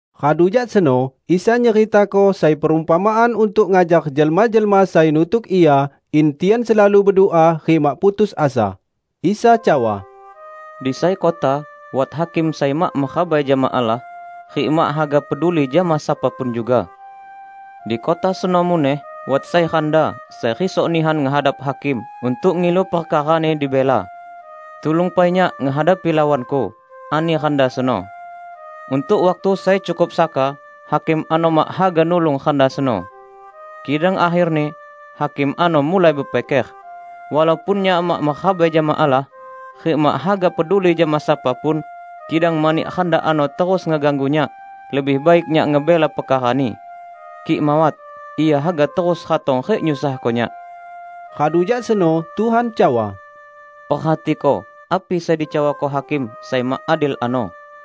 Radu jak seno Isa nyeritako sai perumpamaan untuk ngajar jelma-jelma sai nutuk Ia in tian selalu bedua rik mak putus asa. Isa cawa, "Di sai kota wat hakim sai mak merabai jama Allah, rik mak haga peduli jama sapa pun juga. Di kota seno muneh wat sai randa sai risok nihan ngehadap hakim untuk ngilu perkarani dibela. 'Tulung pai nyak ngehadapi lawanku,' ani randa seno. Untuk waktu sai cukup saka hakim ano mak haga nulung randa seno. Kidang akherni hakim ano mulai bepiker, 'Walaupun nyak mak merabai jama Allah rik mak haga peduli jama sapa pun, kidang mani randa ano terus ngeganggu nyak, lebih baik nyak ngebela perkarani. Kik mawat, ia haga terus ratong rik nyusahko nyak.' " Radu jak seno Tuhan cawa, "Perhatiko api sai dicawako hakim sai mak adil ano!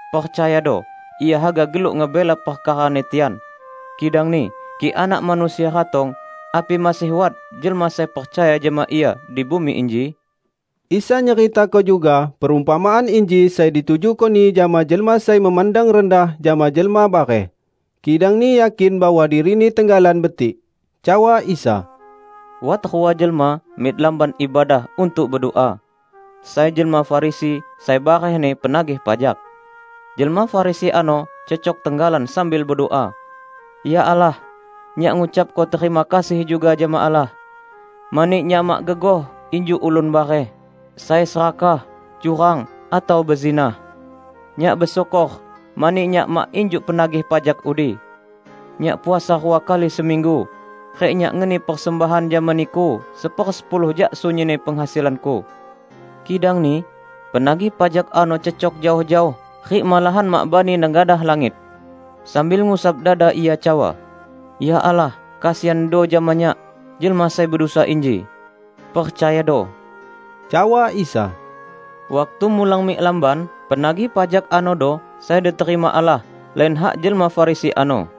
Percayado: Ia haga geluk ngebela perkarani tian! Kidangni kik Anak Manusia ratong, api masih wat jelma sai percaya jama Ia di bumi inji?" Isa nyeritako juga perumpamaan inji sai ditujuko-Ni jama jelma sai memandang rendah jama jelma bareh, kidangni yakin bahwa dirini tenggalan betik. Cawa Isa, "Wat rua jelma mik Lamban Ibadah untuk bedua. Sai jelma Farisi, sai barehni penagih pajak. Jelma Farisi ano cecok tenggalan sambil bedua, 'Ya Allah, nyak ngucapko terima kasih juga jama Allah, mani nyak mak gegoh injuk ulun bareh, sai serakah, curang, atau bezinah. Nyak besyukor mani nyak mak injuk penagih pajak udi. Nyak puasa rua kali seminggu, rik nyak ngeni persembahan jama Niku sepersepuluh jak sunyinni penghasilanku.' Kidangni penagih pajak ano cecok jaoh-jaoh rik malahan mak bani nengadah langit. Sambil ngusap dada ia cawa, 'Ya Allah, kesiando jama nyak, jelma sai bedusa inji!' " "Percayado," cawa Isa, "waktu mulang mik lamban, penagih pajak anodo sai diterima Allah lain hak jelma Farisi ano.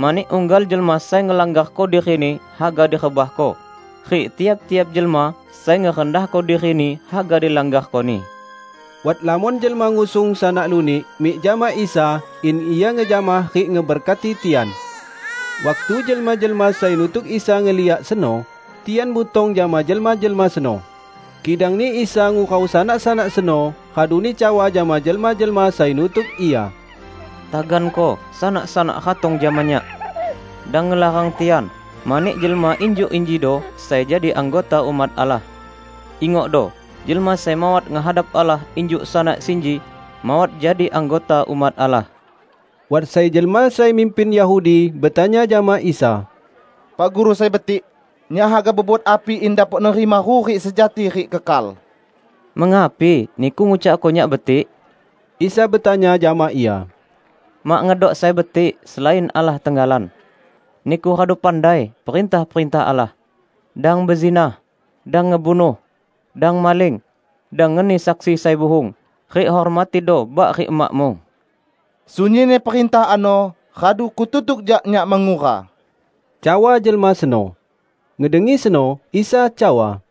Mani unggal jelma sai ngelanggarko dirini haga direbahko; rik tiap-tiap jelma sai ngerendahko dirini haga dilanggarkoni." Wat lamon jelma ngusung sanak lunik mik jama Isa in Ia ngejamah rik ngeberkati tian. Waktu jelma-jelma sai nutuk Isa ngeliak seno, tian butong jama jelma-jelma seno. Kidangni Isa ngurau sanak-sanak seno raduni cawa jama jelma-jelma sai nutuk Ia, "Taganko sanak-sanak ratong jama Nyak! Dang ngelarang tian, mani jelma injuk injido sai jadi anggota umat Allah. Ingokdo! Jelma sai mawat ngehadap Allah injuk sanak sinji, mawat jadi anggota umat Allah." Wat sai jelma sai mimpin Yahudi betanya jama Isa, "Pak Guru sai betik, nyak haga bebuat api in dapok nerima hurik sejati rik kekal?" "Mengapi niku ngucakko Nyak betik?" Isa betanya jama ia. "Mak ngedok sai betik, selain Allah tenggalan. Niku radu pandai perintah-perintah Allah: 'Dang bezinah, dang ngebunuh, dang maling, dang ngeni saksi sai buhung, rik hormatido bak rik emakmu.' " "Sunyinni perintah ano radu kututuk jak nyak mengura," cawa jelma seno. Ngedengi seno, Isa cawa,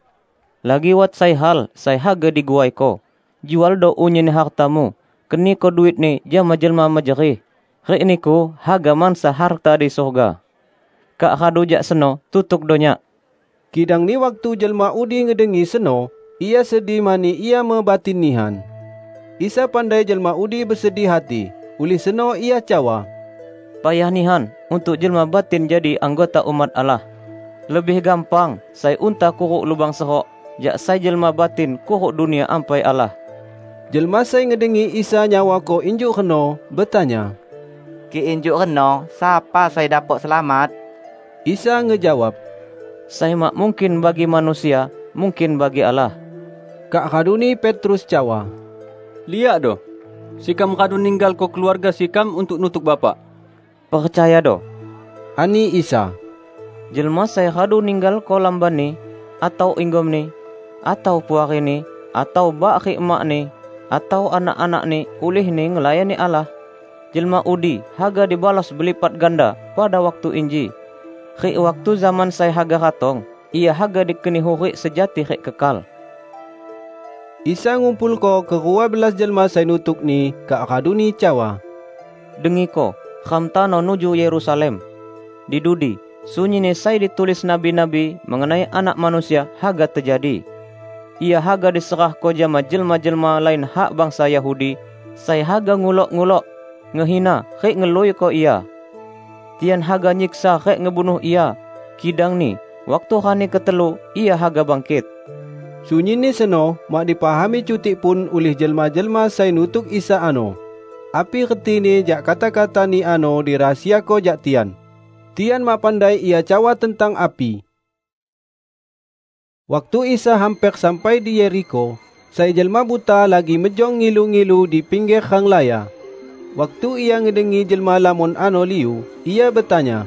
"Lagi wat sai hal sai haga diguaiko: Jualdo unyinni hartamu, keniko duitni jama jelma mejerih, rik niku haga mansa harta di surga. Kak radu jak seno tutukdo Nyak." Kidangni waktu jelma udi ngedengi seno, ia sedih mani ia mebatin nihan. Isa pandai jelma udi besedih hati, ulih seno Ia cawa, "Payah nihan untuk jelma batin jadi anggota umat Allah! Lebih gampang sai unta kuruk lubang serok, jak sai jelma batin kuruk Dunia Ampai Allah." Jelma sai ngedengi Isa nyawako injuk reno, betanya, "Kik injuk reno, sapa sai dapok selamat?" Isa ngejawab, "Sai mak mungkin bagi manusia, mungkin bagi Allah!" Kak raduni Petrus cawa, "Liakdo! Sekam radu ninggalko keluarga sekam untuk nutuk Bapak." "Percayado!" ani Isa. "Jelma sai radu ninggalko lambanni, atau inggomni, atau puarini, atau bak rik emakni atau anak-anakni ulihni ngelayani Allah, jelma udi haga dibalos belipat ganda pada waktu inji, rik waktu zaman sai haga ratong ia haga dikeni hurik sejati rik kekal." Isa ngumpulko kerua belas jelma sai nutuk-Ni, kak raduni cawa, "Dengiko! Ram tano nuju Yerusalem. Di dudi, sunyinni sai ditulis nabi-nabi mengenai Anak Manusia, haga tejadi. Ia haga diserahko jama jelma-jelma lain hak bangsa Yahudi, sai haga ngulok-ngulok, ngehina rik ngeluiko Ia. Tian haga nyiksa rik ngebunuh Ia, kidangni waktu rani ketelu, Ia haga bangkit." Sunyinni seno mak dipahami cutik pun ulih jelma-jelma sai nutuk Isa ano. Api retini jak kata-kata-Ni ano dirahasiako jak tian. Tian mak pandai Ia cawa tentang api. Waktu Isa hamper sampai di Yerikho, sai jelma buta lagi mejong ngilu-ngilu di pingger renglaya. Waktu ia ngedengi jelma lamon ano liu, ia betanya,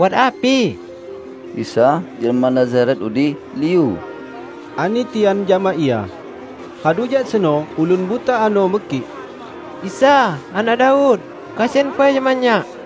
"Wat api?" "Isa, jelma Nazaret udi, liu," ani tian jama ia. Radu jak seno ulun buta ano mekik, "Isa, anak Daud! Kesian pai jama nyak!"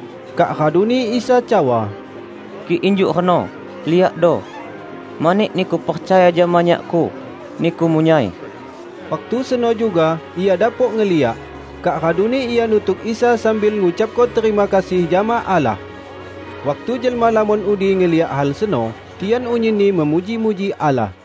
Kak raduni Isa cawa, "Kik injuk reno, liakdo! Mani niku percaya jama Nyak-Ku, niku munyai." Waktu seno juga ia dapok ngeliak, kak raduni ia nutuk Isa sambil ngucapko terima kasih jama Allah. Waktu jelma lamon udi ngeliak hal seno, tian unyinni memuji-muji Allah.